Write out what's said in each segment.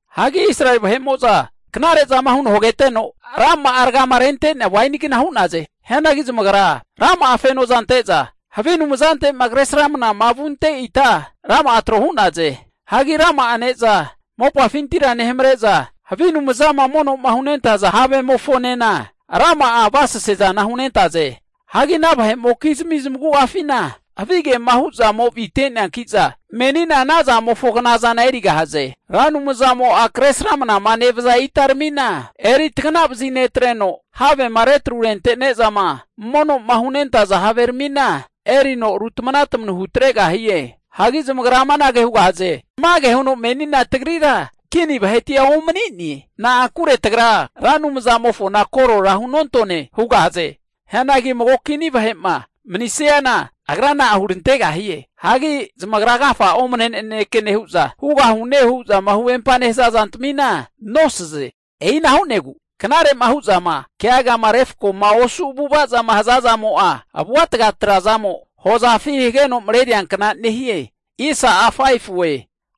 Hagi Israeli vahe'mo'za knare'zama huno hageteno rama'a ragama renentea wainigna hu'naze. Hianagi zamagra rama'a fenoza nente'za ante'za havi anumzante'ma kresramna vunte ita rama'a tro hu'naze. Hagi rama'a ne'za mopafintira nehamare'za, havi anumzama mono'ma hunentaza havemofonena rama'a avasase'zana hunentaze. Hagi ana vahe'mokizmi zamagu'afina havigema hu'zamo avite'neanki'za, menina ana zamofo knazana erigahaze. Ra Anumzamo'a Kresramanama nevaza itaramina eri taganavazi netreno, havema retrurente'nezama mono'ma hunentaza haveramina erino rutamanatamanu hutregahie. Hagi zamagra amanage hugahaze, Tamage huno menina tagrira kini vahetia omani'ne. Na'ankure tagra Ra Anumzamofona korora hunontone hugahaze. Hianagi mago kini vahe'ma manisiana, agra na'a hurantegahie? Hagi zamagra agafa'a omane naneke nehu'za, hugahune hu'zama huvempama nehaza zantamina nosaze. E'ina hu'negu knare'ma hu'zama keagama refkoma osu avu'ava'ma zama nehaza zamo'a avuatga (poisin) trazamo hozafi hageno mareriankna nehie.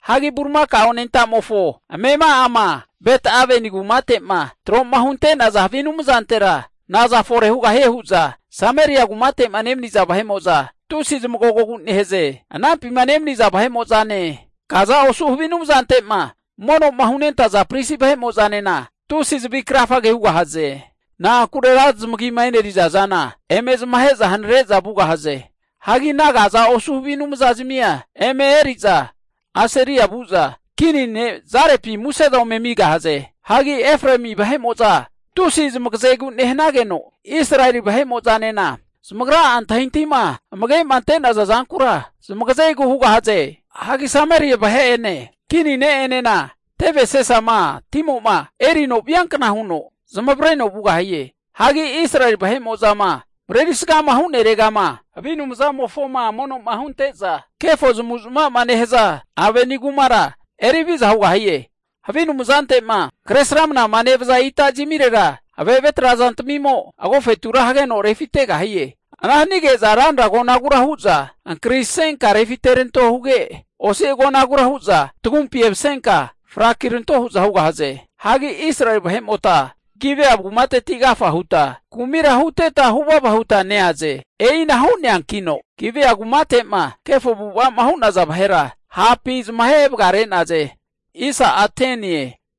Hagi bulimakao anentamofo amema'ama Bet-Aveni kumate'ma troma hunte'naza havi anumzantera naza fore hugahie hu'za Sameria kumate'ma nemaniza vahe'mo'za tusi zmagogogu nehaze. Anampima nemaniza vahe'mo'zane, kaza osu havi anumzante'ma mono'ma hunentaza pristi vahe'mo'zanena tusi zavi krafa hugahaze. Na'ankure ra zamagima e'neriza zana eme zamahe'za hanare'za vugahaze. Hagi ana kaza osu havi anumzazmia eme eriza Asiria vu'za kini ne' Jarebina muse'za ome amigahaze. Hagi Efraemi vahe'mo'za tusi zamagazegu nehanageno, Israeli vahemo'zanena zamagra'a antahintahima amage'ma ante'naza zankura zamagazegu hugahaze. Hagi Sameria vahe'ene kini ne'enena teve asesama timo'ma erino viankna huno zamavareno vugahie. Hagi Israeli vahe'mo'zama marerisgama huneregama havi anumzamofoma mono'ma hunte'za kefo zamavu'zamava zama nehaza Aveni kumara eri haviza hugahie. Havi anumzante'ma Kresramanama nevaza itazmirera ave'ave trazantamimo agofetura hageno refitegahie. Ana hanige'za ranra agonagura hu'za ankrisenka refiteranto huge, osi agonagura hu'za tagumpi emasenka frakiranto hu'za hugahaze. Hagi Israeli vahemota Gibea kumateti agafa huta kumira huteta huvava huta neaze. E'ina hu'neankino Gibea kumate'ma kefo avu'ava'ma hu'naza vahera hapi zamahe vagare'naze.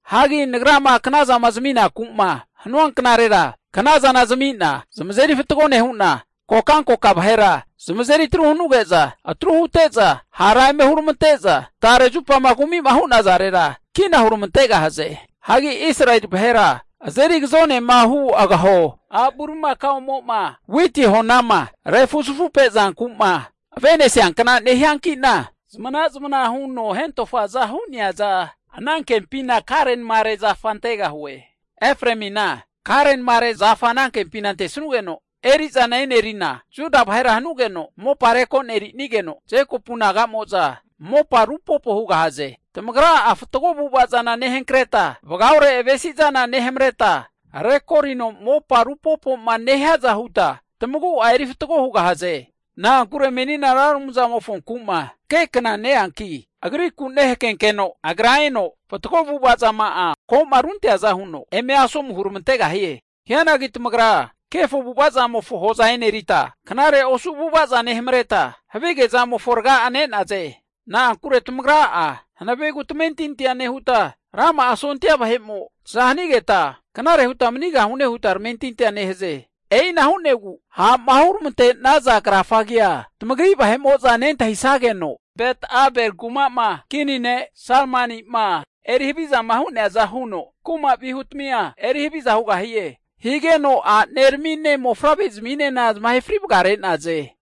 Hagi Nagrama knazama zaminaku'ma hanua knarera knazana zami'na zamazeri fatgo nehu'na, kokankoka vahera zamazeri atru hanuge'za atru hute'za, hara eme huramante'za tare zupama kumi'ma hu'nazarera kina huramantegahaze. Hagi Israeli vahera azeri agazonema hu agaho a' bulimakaomo'ma witi honama refuzafupe zanku'ma ave'nesiankna nehianki'na, zamana'zamana huno hentofaza hu'neaza anankempina karenamere zafa antegahue. Efraemina karenamare zafa anankempi ante'nugeno erizana enerina, Juda vahera hanugeno mopa rekonerinigeno, Jekopu naga'mo'za mopa rupopo hugahaze. Tamagra'a fatgo avu'ava zana nehankreta, vagaore avesizana nehamareta, rekorino mopa rupopoma nehiaza huta tamagua eri fatgo hugahaze. Na'ankure menina Ra Anumzamofonku'ma hakekna neanki Agriku nehakenkeno, Agra eno fatgo avu'ava zama'a koma runteaza huno eme asomu huramantegahie. Hianagi tamagra kefo avu'ava zamofo hoza enerita, knare osu avu'avaza nehamareta, havige zamofo raga'a ne'naze. Na'ankure tamagra'a hanavegu tamentintia nehuta, rama'a sondia vahe'mo'za taza hanageta knare huta manigahune huta tamentintia nehaze. E'ina hu'negu ha'ma huramante'naza krafagea tamagri vahe'mo'za nentahisageno, Bet-Abeli kuma'ma kini ne' Salmani'ma eri havizama hu'neaza huno kuma vihutamia eri haviza hugahie. Higeno aneramine mofavrezminena zamahe fri vagare'naze.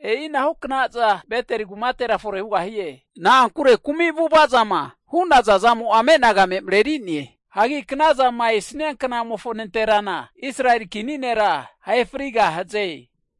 E'inahu knaza Beteli kumatera fore hugahie. Na'ankure kumi avu'ava zama hu'naza zamo'a amenagame mareri'ne. Hagi knazama esania knamofo nanterana, Israeli kini nera ahe frigahaze.